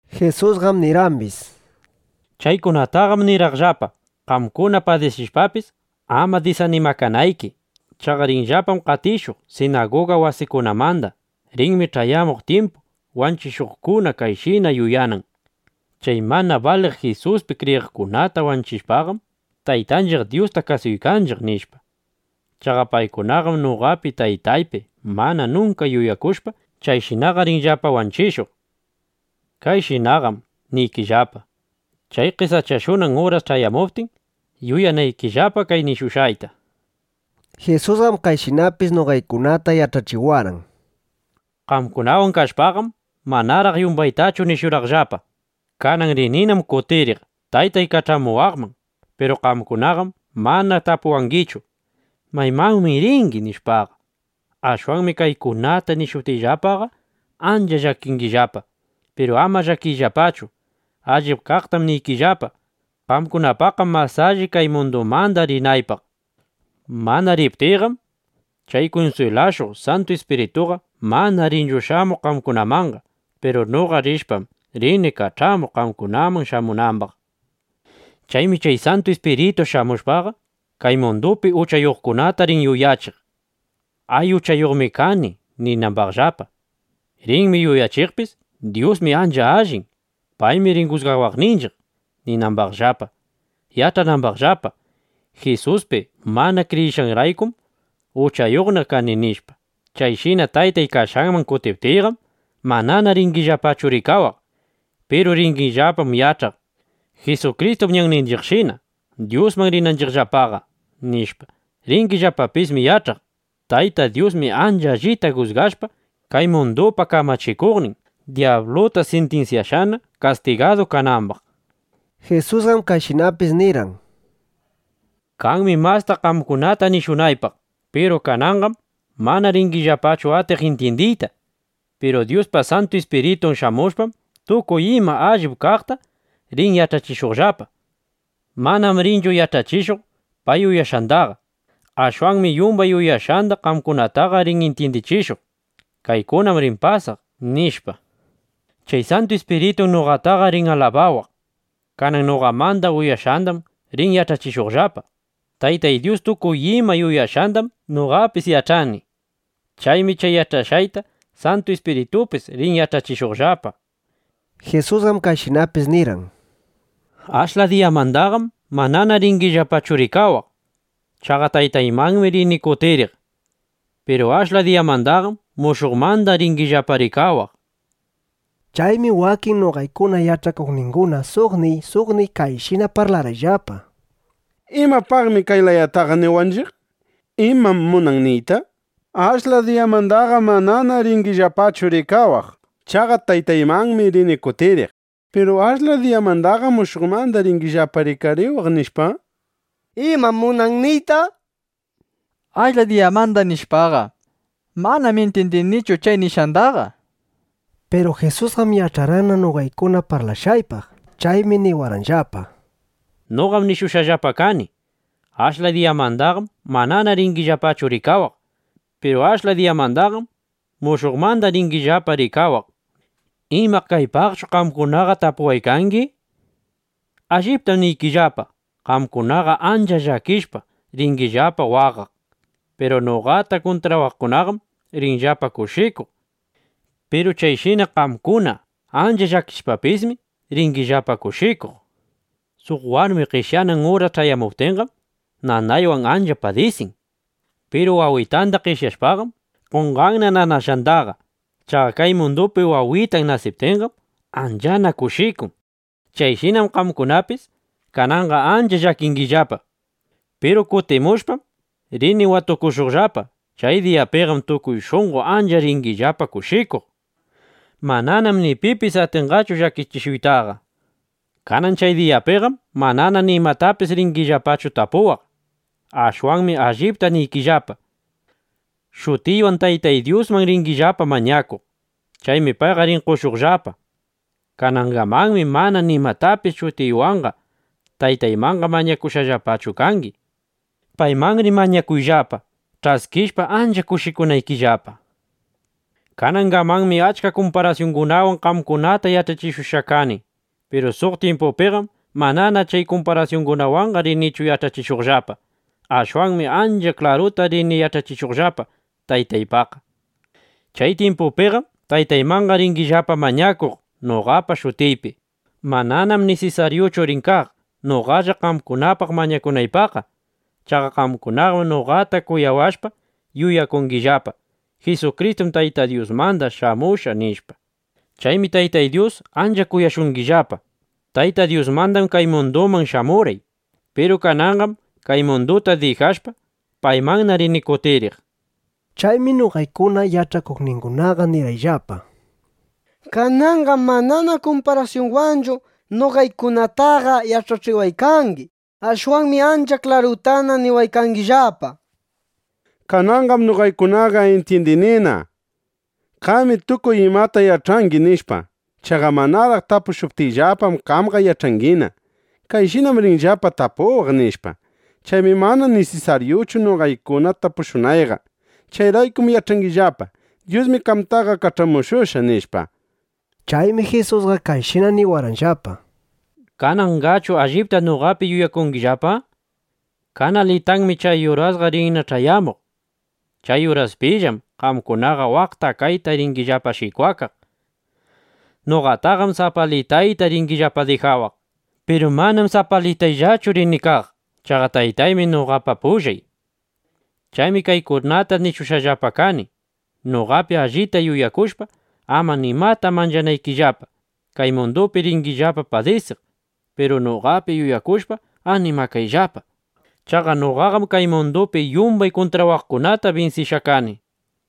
Jisusqam nirqambis: —Chaykunataqam nirqaqllapa, qamkuna padisishpapis, ama disanimakanayki. Chaqa rinllapam qatishuq sinaguga wasikunamanda. Rinmi ch'ayamuq tyimpu, wanchishuqkuna kayshina yuyanan: Chay mana baliq Jisuspi kriyiqkunata wanchishpaqam, Taytanchiq Dyusta kasuykanchiq, nishpa. Chaqa paykunaqam noqapi Taytaypi mana nunka yuyakushpa, chayshinaqa rinllapa wanchishuq. Kayshinaqam niykillapa, chay qesachashunan uras ch'ayamuptin, yuyanaykillapa kay nishushqayta, nishpa. Jisusqam kayshinapis noqaykunataqa yach'achiwarqan: —Qamkunawan kaykashpam, manaraq yumbaytachu nishurqaqllapa. Kanan rininam kutiriq Taytay kach'amuwaqman. Piru qamkunaqam mana tapuwangichu: “¿Maymanmi ringi?” nishpaqa. Ashwanmi kaykunata nishuptiyllapaqa, ancha llakingillapa. Piru ama llakiyllapachu. Allip kaqtam niykillapa. Qamkunapaqqam mas alli, kay mundumanda rinaypaq. Mana riptiyqam, chay kunswilashuq Santu Ispirituqa mana rinchu shamuq qamkunamanqa. Piru noqa rishpam, rini kach'amuq, qamkunaman shamunambaq. Chaymi chay Santu Ispiritu shamushpaqa, kay mundupi uchayuqkunata rin yuyachiq: Ay, uchayuqmi kani, ninambaqllapa. Rinmi yuyachiqpis: Dyusmi ancha allin. Paymi rin jusgawaqninchiq, ninambaqllapa, yach'anambaqllapa: Jisuspi mana kriyishqayraykum, uchayuqna kani, nishpa. Chayshina Taytay kashqanman kutiptiyqam, manana ringillapachu rikawaq. Piru ringillapam yach'aq: Jisukristum ñanninchiqshina, Dyusman rinanchiqllapaqa, nishpa. Ringillapapismi yach'aq: Tayta Dyusmi, ancha allita jusgashpa, kay mundupa kamachikuqnin dyabluta sintinsyashqana, kastigadu kanambaq, nishpa. Jisusqam kayshinapis nirqan: —Kanmi masta qamkunata nishunaypaq. Piru kananqam mana ringillapachu atiq intyindiyta. Piru Dyuspa Santu Ispiritun shamushpam, tukuy ima allip kaqta rin yach'achishuqllapa. Manam rinchu yach'achishuq pay yuyashqandaqa. Ashwanmi yumbay uyashqanda qamkunataqa rin intyindichishuq: Kaykunam rin pasaq, nishpa. Chay Santu Ispiritum noqataqa rin alabawaq. Kanan noqamanda uyashqandam rin yach'achishuqllapa. Taytay Dyus tukuy ima yuyashqandam noqapis yach'ani. Chaymi chay yach'ashqayta Santu Ispiritupis rin yach'achishuqllapa, nishpa. Jisusqam kayshinapis nirqan: —Ashla diyamandaqam manana ringillapachu rikawaq. ˻Chaqa Taytaymannam rini kutiriq.˼ Piru ashla diyamandaqam mushuqmanda ringillapa rikariwaq, nishpa. Chaymi wakin noqaykuna yach'akuqningunaqa suqniy suqniy kayshina parlarqayllapa: —¿Imapaqmi kay layataqa niwanchiq? ¿Imam munan niyta: “Ashla diyamandaqam manana ringillapachu rikawaq. Chaqa Taytaymanmi rini kutiriq. Piru ashla diyamandaqam mushuqmanda ringillapa rikariwaq”, nishpa? ¿Imam munan niyta, “Ashla diyamanda”, nishpaqa? Manam intyindinichu chay nishqandaqa, nishpa. Piru Jisusqam yach'arqanna noqaykuna parlashqaypaq. Chaymi niwarqanllapa: —Noqam nishushqallapa kani: “Ashla diyamandaqam manana ringillapachu rikawaq. Piru ashla diyamandaqam mushuqmanda ringillapa rikariwaq” nishpa. ¿Ima, kaypaqchu qamkunaqa tapunakuykangi? Alliptam niykillapa, qamkunaqa ancha llakishpa, ringillapa waqaq. Piru noqata kuntrawaqkunaqam rinllapa kushikuq. Piru chayshina qamkuna ancha llakishpapismi, ringillapa kushikuq. Suq warmi qeshyanan uras ch'ayamuptinqam, nanaywan ancha padisin. Piru wawitanda qeshyashpaqam, qonqanna nanashqandaqa. Chaqa kay mundupi wawitan nasiptinqam, anchana kushikun. Chayshinam qamkunapis kananqa ancha llakingillapa. Piru kutimushpam, rini watukushuqllapa. Chay diyapiqam tukuy shunqo ancha ringillapa kushikuq. Mananam ni pipis atinqachu llakichishuytaqa. ’Kanan chay diyapiqam manana nimatapis ringillapachu tapuwaq. Ashwanmi allipta niykillapa, shutiywan Taytay Dyusman ringillapa mañakuq. Chaymi payqa rin qoshuqllapa. Kanangamanmi mana nimatapis shutiywanqa Taytaymanqa mañakushqallapachu kangi. Paymanri mañakuyllapa, ch'askishpa, ancha kushikunaykillapa. ’Kanangamanmi achka kumparasyunwan qamkunata yach'achishushqa kani. Piru suq tyimpupiqam manana chay kumparasyungunawanqa rinichu yach'achishuqllapa. Ashwanmi ancha klaruta rini yach'achishuqllapa Taytaypaqqa. Chay tyimpupiqam Taytaymanqa ringillapa mañakuq noqapa shutiypi. Mananam nisisaryuchu rin kaq, noqalla qamkunapaq mañakunaypaqqa. Chaqa qamkunaqam noqata kuyawashpa, yuyakungillapa: Jisukristum Tayta Dyusmanda shamushqa, nishpa. Chaymi Taytay Dyus ancha kuyashungillapa. Tayta Dyusmandam kay munduman shamurqay. Piru kananqam kay munduta dijashpa, paymanna rini kutiriq, nishpa. Chaymi noqaykuna yach'akuqningunaqa nirqayllapa: —Kananqam manana kumparasyunwanchu noqaykunataqa yach'achiwaykangi. Ashwanmi ancha klarutana niwaykangillapa. Kananqam noqaykunaqa intyindinina: Qami tukuy imata yach'angi, nishpa. (Chaqa manaraq tapushuptiyllapam, qamqa yach'angina: Kayshinam rinllapa tapuwaq, nishpa.) Chaymi mana ni nisisaryuchu noqaykuna tapushunayqa. Chayraykum yach'anillapa: Dyusmi qamtaqa kach'amushushqa, nishpa. Chaymi Jisusqa kayshina niwarqanllapa: —¿Kananqachu allipta noqapi yuyakungillapa? Kanalitanmi chay urasqa rinna ch'ayamuq. Chay uraspillam qamkunaqa waqta kayta ringillapa shikwakaq. Noqataqam sapalitayta ringillapa dijawaq. Piru manam sapalitayllachu rini kaq. Chaqa Taytaymi noqapa pullay. Chaymi kaykunata nishushqallapa kani, noqapi allita yuyakushpa, ama nimata manchanaykillapa. Kay mundupi ringillapa padisiq. Piru noqapi yuyakushpa, animakayllapa. Chaqa noqaqam kay mundupi yumbay kuntrawaqkunata binsishqa kani.